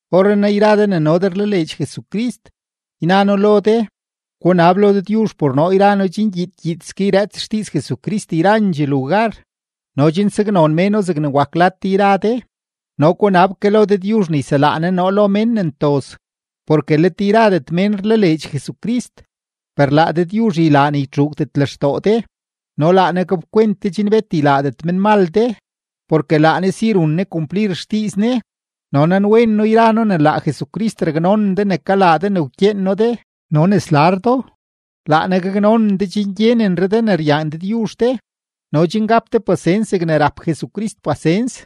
Orrenaa yra de ne no de rlaleedx Jesucrist, yna noo lo de, gunab lo Dëdyuzh por noo yra noo chen gyiid gyiidske yrëëts xdiiz Jesucrist yrandxee lugar no chen saknon méno zegne wak lad de yra de. No gunab ke lo Dëdyuzh ne yselaa Ne noo lo mén ne ntoz, porke let yradet mén rlaleedx Jesucrist. Per laa Dëdyuzh ylaa ne ytxuugdet lextoo de no laa Ne gapkwent de chen bet ylaadet menmal de, porke laa Ne si run Ne kumplir xdiiz Ne. No nanwen noo yra noo ne laa Jesucrist raknonen de ne kalaa de ne wkyeen noo de no ne slar do. Laa Ne gaknonen de chen gyenenre de ne ryaan Dëdyuzh de no chen gap de pasens zegne rap Jesucrist pasens.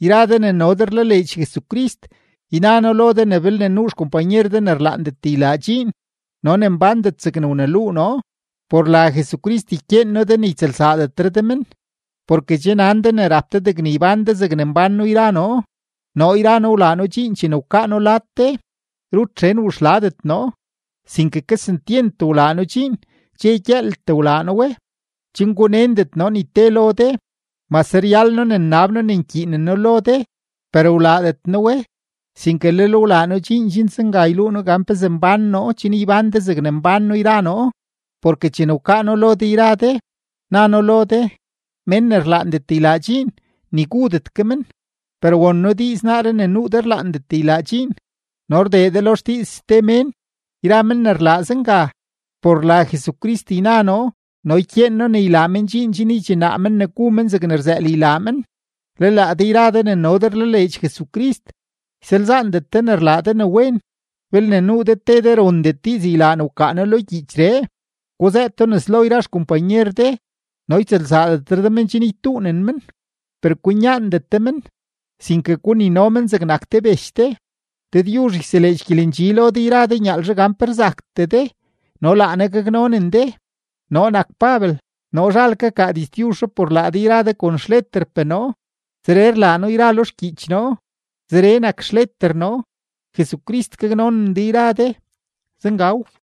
Yra de ne no de rlaleedx Jesucrist, yna noo lo de ne belne nuu xkompanyer de ne rlaandet ylaa dxiin no ne mbándet zegne wneluu noo, por la Jesucrist ykyeen noo de ne ytsëlsaadetre de men. Porke che nan de ne rap de degne ybán de zegne mbán noo yra noo. Noo yra noo wlaa noo dxiin chene wkaa noo lad de, rut xen wuxladet noo, sinke kesentyent wlaa noo dxiin, dxe gyëëltee wlaa noo we chen gunendet noo ni te lo de. Mase ryal noo ne nnab noo ne nkyiinen noo lo de, per wlaadet noo we, sinke lel wlaa noo dxiin chen zenga yluu noo gan pezee mbán noo chen ybán de zegne mbán noo yra noo. Porke chene wkaa noo lo de yra de, na noo lo de: Mén ne rlaandet ylaa dxiin, ni gudet ke men. Per won noo diiz naaree ne nuu de rlaandet ylaa dxiin, no rdee de lo xdiiz ste mén. Yra men ne rlaa zenga, por la Jesucrist yna noo no ykyeen noo ne ylaa men dxiin chen ydxinaa men ne gu men zegne rzëël ylaa men. Le laa de yra de ne no de rlaleedx Jesucrist, ysalzaandet de ne rlaa de ne wen. Belne nuu de te de ne rondet diiz ylaa ne wkaa noo lo gyiichree, guzëëto nes lo yra xkompanyer de no ytsëlsaadetre de men chen ytuunen men. Per kwinyaandet de men, sinke gunino men zegnak te bech de. Dëdyuzh yseleedx gyelendxi lo de yra de nyaalzhe gan pe rzaktee de no laa Ne gaknonen de. Noo nak Pabel, noo zhal kakaa diztyuzhree por laa de yra de kon xleterpee noo. Zeree rlaa noo lo yra xgyiich noo, zeree nak xleter noo. Jesucrist gaknonen de yra de. Zengaw.